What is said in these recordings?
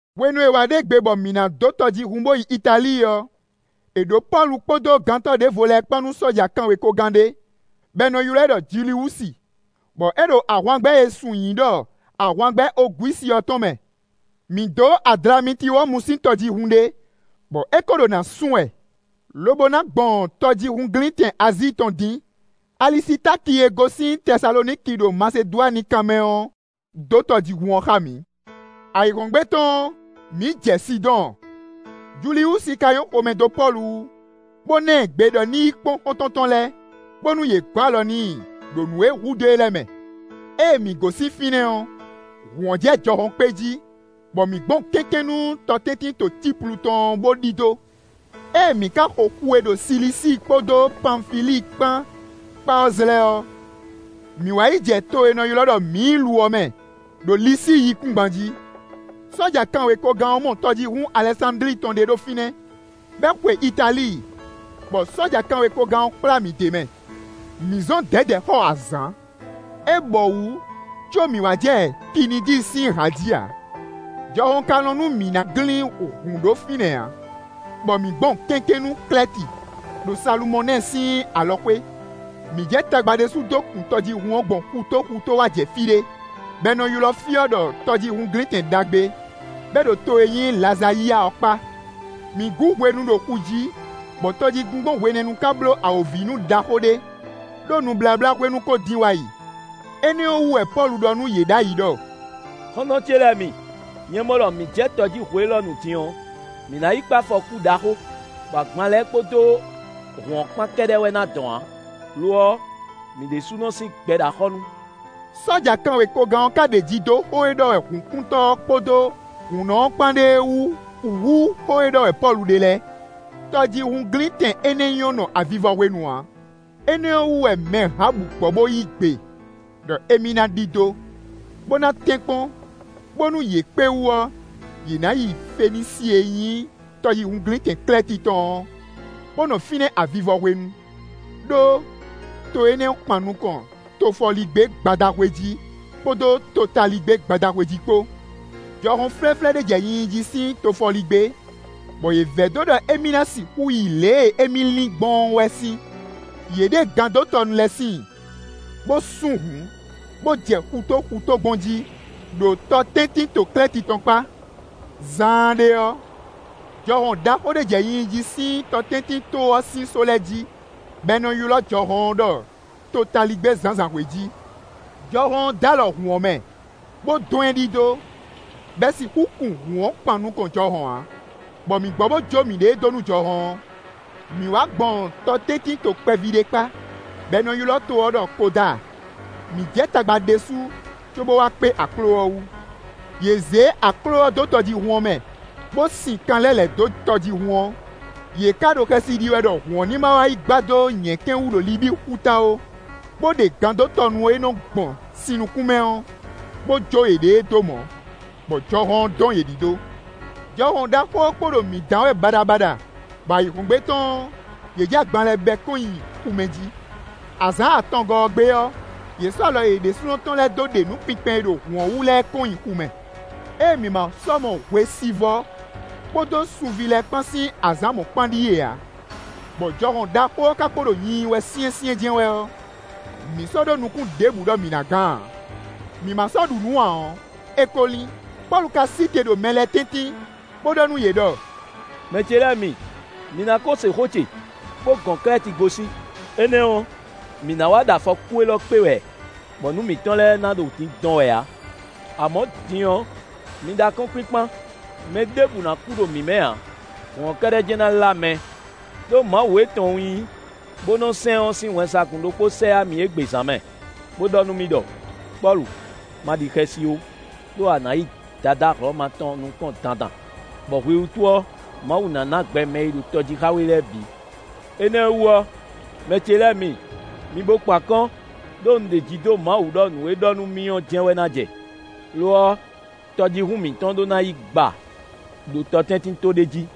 Hwenu e è wǎ ɖe gbe bɔ mǐ ná dó tɔjíhún bo yi Italíi ɔ́, è ɖǒ Pɔ́lu kpódó gantɔ́ ɖěvo lɛ́ɛ kpán nú sɔ́ja kanwekogán ɖé, bɔ è nɔ ylɔ́ ɛ ɖɔ Juliwusi, bɔ é ɖo ahwangbɛ́ e è sun nyǐ ɖɔ ahwangbɛ́ Ogwísi ɔ́ tɔn mɛ. Mǐ dǒ Adlamitiwɔmu sín tɔjíhún ɖé, bɔ é ko ɖo nǎ sún wɛ, lobo ná gbɔn tɔjíhúnglíntɛn Azíi tɔn dín. Alisitáki e gosín Tɛsaloniki ɖo Masedwani kanmɛ ɔ́ dó tɔjíhún ɔ́ xá mǐ. Ayǐhɔ́ngbe tɔn ɔ́, mǐ jɛ Sidɔ́ɔn; Juliwusi ka nyɔ́ xomɛ dó Pɔ́lu wú, bó ná ɛ gbe ɖɔ ní yi kpɔ́n xɔ́ntɔn tɔn lɛ́ɛ, bónú yě gɔ̌ alɔ n'i ɖo nǔ e hudó e lɛ́ɛ mɛ. Ée mǐ gosín fínɛ́ ɔ́, hǔn ɔ́ jɛ jɔhɔn kpé jí, bɔ mǐ gbɔn kɛ́nkɛ́n nú tɔtɛ́ntinto Cíplu tɔn ɔ́ bó ɖidó. Ée mǐ ka xo xu e ɖo Silisíi kpódó Panfilíi kpán kpá ɔ́ zlɛ́ ɔ́, mǐ wá yi jɛ to e è nɔ ylɔ́ ɖɔ Míilu ɔ́ mɛ, ɖo Lisíi yíkúngban jí. Sɔ́ja kanwekogán ɔ́ mɔ tɔjíhún Alɛsándli tɔn ɖé ɖo fínɛ́, bɔ é xwe Italíi, bɔ sɔ́ja kanwekogán ɔ́ kplá mǐ d'é mɛ. Mǐ zɔn dɛ̌dɛ̌ xɔ azǎn; é bɔwǔ có mǐ wá jɛ Kinidi sín hǎ jí ǎ; jɔhɔn ka lɔn nú mǐ ná glín hǔn ɖó fínɛ́ ǎ, bɔ mǐ gbɔn kɛ́nkɛ́n nú Klɛ́ti, ɖo Salumɔnɛ́ɛ sín alɔxwé. Mǐ jɛ tagba ɖésú dó kun tɔjíhún ɔ́ gbɔn xutó xutó wá jɛ fí ɖé, bɔ è nɔ ylɔ́ fí ɔ́ ɖɔ Tɔjíhúnglintɛn ɖagbe, bɔ é ɖo to e nyí Lazayia ɔ́ kpá. Mǐ gǔ hwenu ɖo xu jí, bɔ tɔ jí gbingbɔn hwenɛ́nu ka bló awǒvinú ɖaxó ɖé, ɖó nubláblá hwenu ko dín wa yi; énɛ́ ɔ́ wú wɛ Pɔ́lu ɖɔ nú yě ɖ'ayǐ ɖɔ: “Xɔ́ntɔn ce lɛ́ɛ mi, nyɛ mɔ ɖɔ mǐ jɛ tɔ jí hwe élɔ́ nu din ɔ́, mǐ ná yi kpé afɔkú ɖaxó, bɔ agban lɛ́ɛ kpódó hǔn ɔ́ kpán kɛ́ɖɛ́ wɛ ná dɔn ǎ, lo ɔ́, mǐ ɖésúnɔ sín gbɛ ɖo axɔ́ nu.” Sɔ́ja kanwekogán ɔ́ ka ɖeji dó xó e ɖɔ wɛ hǔnkuntɔ́ ɔ́ kpódó hǔnnɔ ɔ́ kpán ɖe é wú hú xó e ɖɔ wɛ Pɔ́lu ɖe lɛ́ɛ. Tɔjíhúnglíntɛn énɛ́ nyɔ́ nɔ avivɔ hwenu ǎ; énɛ́ ɔ́ wú wɛ mɛ hǎbǔ gbɔ bó yí gbe ɖɔ émí ná ɖidó, bó ná tɛ́nkpɔ́n bónú yě kpé wú ɔ́, yě ná yi Fenísi e nyí tɔjíhúnglíntɛn Klɛ́ti tɔn ɔ́, bó nɔ fínɛ́ avivɔ hwenu; ɖó to énɛ́ kpan nukɔn tofɔligbé-gbadahwe jí, kpódó totaligbé-gbadahwe jí kpó. Jɔhɔn flɛ́flɛ́ ɖé jɛ nyinyi jí sín tofɔligbé, bɔ yě vɛdó ɖɔ émí ná sixú yi lě e émí lin gbɔn ɔ́ wɛ sín; yě ɖe gandótɔnu lɛ́ɛ síin, bó sún hǔn, bó jɛ xutó xutó gbɔn jí, ɖo tɔtɛ́ntinto Klɛ́ti tɔn kpá. Zaanɖé ɔ́, jɔhɔn ɖaxó ɖé jɛ nyinyi jí, sín tɔtɛ́ntinto ɔ́ sín só lɛ́ɛ jí, bɔ è nɔ ylɔ́ jɔhɔn ɔ́ ɖɔ “Totaligbé-zǎnzǎnhwe jí.” Jɔhɔn ɔ́ d'alɔ hǔn ɔ́ mɛ, bó dɔn ɛ ɖidó, bɔ è sixú kun hǔn ɔ́ kpán nukɔn jɔhɔn ǎ, bɔ mǐ gbɔ bó jó miɖée dó nú jɔhɔn ɔ́. Mǐ wá gbɔn tɔtɛ́ntinto kpɛví ɖé kpá, bɔ è nɔ ylɔ́ to ɔ́ ɖɔ Kodáa. Mǐ jɛ tagba ɖésú, cóbó wá kpé akló ɔ́ wú. Yě zé akló ɔ́ dó tɔjíhún ɔ́ mɛ, bó sin kan lɛ́ lɛ̌ dó tɔjíhún ɔ́; yě ka ɖo xɛsi ɖi wɛ ɖɔ hǔn ɔ́ ní ma yi gba dó nyɛ̌kɛ́n wú ɖo Libíi xuta ó, bó ɖe gandótɔnu e nɔ gbɔn sin nukún mɛ ɔ́, bó jó yěɖée dó mɔ̌, bɔ jɔhɔn ɔ́ dɔn yě ɖidó. Jɔhɔn ɖaxó ɔ́ kpo ɖo mǐ dán wɛ baɖabaɖa, bɔ ayǐhɔ́ngbe tɔn ɔ́, yě jɛ agban lɛ́ɛ bɛ́ kɔn nyi xu mɛ jí. Azǎn atɔngɔ́ ɔ́ gbe ɔ́, yě sɔ́ alɔ yě ɖésúnɔ tɔn lɛ́ɛ dó ɖe nǔ kpinkpɛn e ɖo hǔn ɔ́ wú lɛ́ɛ kɔn nyi xu mɛ. Ée mǐ ma sɔ́ mɔ hwesivɔ́ kpódó sunví lɛ́ɛ kpán sín azǎn mɔ̌kpán ɖíe ǎ, bɔ jɔhɔn ɖaxó ɔ́ ka kpo ɖo nyinyi wɛ syɛ́nsyɛ́n jɛ́n wɛ ɔ́, mǐ sɔ́ ɖó nukún ɖěbǔ ɖɔ mǐ ná gán ǎ. Mǐ ma sɔ́ ɖu nǔ ǎ ɔ́, é kó lín. Pɔ́lu ka sí te ɖo mɛ lɛ́ɛ tɛ́ntin, bó ɖɔ nú yě ɖɔ: “Mɛ ce lɛ́ɛ mi, mi ná ko se xó ce, bó gɔn Klɛ́ti gosín; énɛ́ ɔ́, mǐ ná wá ɖo afɔkú élɔ́ kpé wɛ, bɔ nǔ mǐtɔn lɛ́ɛ ná ɖo dindɔn wɛ ǎ. Amɔ̌, din ɔ́, mi ɖó akɔ́nkpinkpan, mɛ ɖěbǔ ná kú ɖo mǐ mɛ ǎ; hǔn ɔ́ kɛ́ɖɛ́ jɛ́n ná lá mɛ. Đó Mawu e tɔn un nyí, bó nɔ́ sɛn ɔ́ sín wɛnsagun ɖokpó sɛ yá mì égbé zǎn mɛ, bó ɖɔ nú mì ɖɔ: ‘Pɔ́lu, ma ɖi xɛsi ó, ɖó a nǎ yi Dadá Hlɔ̌ma tɔn nukɔn dandan, bɔ hwi wútu ɔ́, Mawu ná ná gbɛ mɛ e ɖo tɔ jí xá we lɛ́ɛ bǐ.’ Énɛ́ wú ɔ́, mɛ ce lɛ́ɛ mi, mi bo kpán akɔ́n, ɖó un ɖeji dó Mawu wú ɖɔ nǔ e é ɖɔ nú mì ɔ́ jɛ́n wɛ ná jɛ. Lo ɔ́, tɔjíhún mǐtɔn ɖó ná yi gba ɖo tɔtɛ́ntinto ɖé jí.”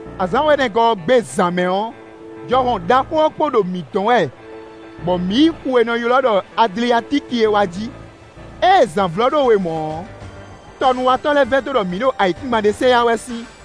Azǎn wɛ̌nɛgɔ́ ɔ́ gbe zǎn mɛ ɔ́, jɔhɔn ɖaxó ɔ́ kpo ɖo mǐ dɔn wɛ bɔ mǐ yi xu e è nɔ ylɔ́ ɖɔ Adliatíki é wa jí; ée zǎn vlɔ́ ɖó we mɔ̌ ɔ́, tɔnúwatɔ́ lɛ́ɛ vɛdó ɖɔ mǐ ɖo ayǐkúngban ɖé sɛ yá wɛ sín,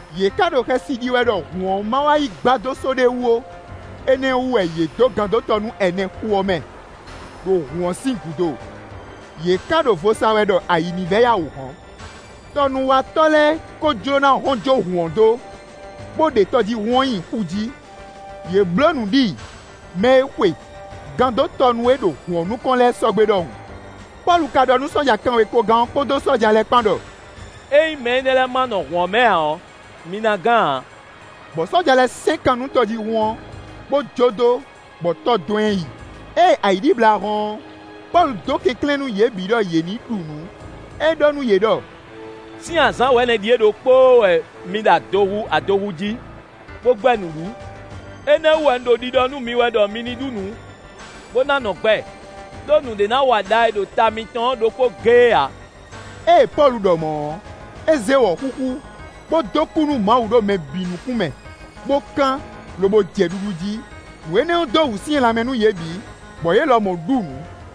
Yě ka ɖo xɛsi ɖi wɛ ɖɔ hǔn ɔ́ ma wá yi gba dó só ɖé wú ó; énɛ́ ɔ́ wú wɛ yě dó gandótɔnu ɛnɛ xu ɔ́ mɛ, ɖo hǔn ɔ́ sín gúdo; yě ka ɖo vo sa wɛ ɖɔ ayǐ ní vɛ́ yá wǔ hɔ́n. Tɔnúwatɔ́ lɛ́ɛ kó jló ná hɔn jó hǔn ɔ́ dó, bó ɖe tɔjíhún ɔ́ nyi xu jí; yě bló nǔ ɖi mɛ e xwe gandótɔnu e ɖo hǔn ɔ́ nukɔn lɛ́ɛ sɔ́ gbé ɖɔhun. Pɔ́lu ka ɖɔ nú sɔ́ja kanwekogán ɔ́ kpódó sɔ́ja lɛ́ɛ kpán ɖɔ: “Ényí mɛ énɛ́ lɛ́ɛ ma nɔ hǔn ɔ́ mɛ ǎ ɔ́, mi ná gán ǎ.” Bɔ sɔ́ja lɛ́ɛ sɛ́n kan nú tɔjíhún ɔ́, bó jó dó, bɔ tɔ dɔn ɛ yi. Ée ayǐ ɖibla hɔ́n ɔ́, Pɔ́lu dó kɛnklɛ́n nú yě bǐ ɖɔ yě ní ɖu nǔ; é ɖɔ nú yě ɖɔ: “Sín azǎn wɛ̌nɛ ɖíe ɖokpóó wɛ mi ɖo adohu adohu jí, bó gbɛ́ nǔ ɖu. Énɛ́ wú wɛ un ɖo ɖiɖɔ nú mi wɛ ɖɔ mi ní ɖu nǔ, bó ná nɔ gbɛ, ɖó nǔɖé ná wa ɖa e ɖo ta mitɔn ɔ́ ɖokpó géé ǎ.” Ée Pɔ́lu ɖɔ mɔ̌ ɔ́, é zé wɔ̌xúxú, bó dó kú nú Mawu ɖo mɛ bǐ nukún mɛ, bó kán, lobo jɛ ɖuɖu jí. Nǔ énɛ́ dó wǔsyɛ́n lanmɛ nú yě bǐ, bɔ yě lɔmɔ̌ ɖu nǔ.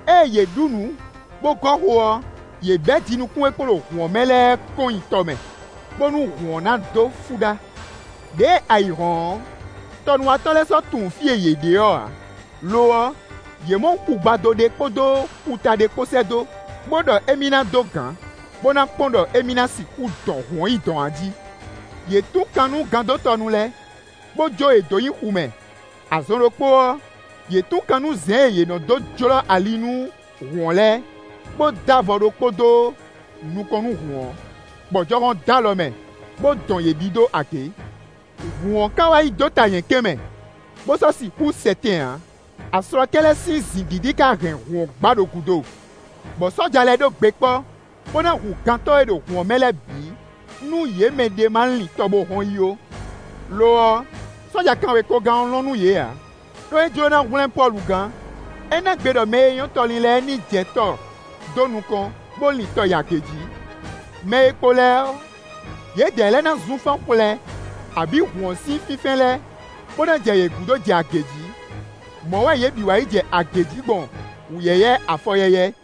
Ée yě ɖu nǔ bó gɔ́ xo ɔ́, yě bɛ́ jinukún e kpo ɖo hǔn ɔ́ mɛ lɛ́ɛ kɔn nyi tɔ mɛ, bónú hǔn ɔ́ ná dó fúɖá. Đěe ayǐ hɔ́n ɔ́, tɔnúwatɔ́ lɛ́ɛ sɔ́ tunwun fí e yě ɖe ɔ́ ǎ; lo ɔ́, yě mɔ xugbado ɖé kpódó xuta ɖé kpó sɛ́ dó, bó ɖɔ émí ná dó gǎn, bó ná kpɔ́n ɖɔ émí ná sixú dɔn hǔn ɔ́ yi dɔ̌n a jí. Yě tún kan nú gandótɔnu lɛ́ɛ, bó jó yě dó nyi xu mɛ; azɔn ɖokpó ɔ́, yě tún kan nú zɛn e yě nɔ dó jlɔ́ ali nú hǔn ɔ́ lɛ́ɛ, bó dó avɔ ɖokpó dó nukɔn nú hǔn ɔ́, bɔ jɔhɔn dó alɔ mɛ, bó dɔn yě ɖidó agě. Hǔn ɔ́ ka wá yi dó ta nyɛ̌kɛ́n mɛ, bó sɔ́ sixú sɛ tɛn ǎ; aslɔkɛ́ lɛ́ɛ sín zǐngídi ká hɛn hǔn ɔ́ gba ɖo gúdo. Bɔ sɔ́ja lɛ́ɛ ɖó gbe kpɔ́, bó ná hu gantɔ́ e ɖo hǔn ɔ́ mɛ lɛ́ɛ bǐ, nú yě mɛ ɖě ma lin tɔ bó hɔn yi ó. Lo ɔ́, sɔ́ja kanwekogán ɔ́ lɔn nú yě ǎ, ɖó é jló ná hwlɛ́n Pɔ́lu gán. É ná gbe ɖɔ mɛ e nyɔ́ tɔ lin lɛ́ɛ ní jɛ tɔ dó nukɔn, bó lin tɔ yi agě jí. Mɛ e kpo lɛ́ɛ ɔ́, yědɛɛ lɛ́ɛ na zunfán xwlɛ, abǐ hǔn ɔ́ sín fínfɛ́n lɛ́ɛ, bó ná jɛ yě gúdo jɛ agě jí. Mɔ̌ wɛ yě bǐ wá yi jɛ agě jí gbɔn wǔyɛ́yɛ́ afɔyɛ́yɛ́.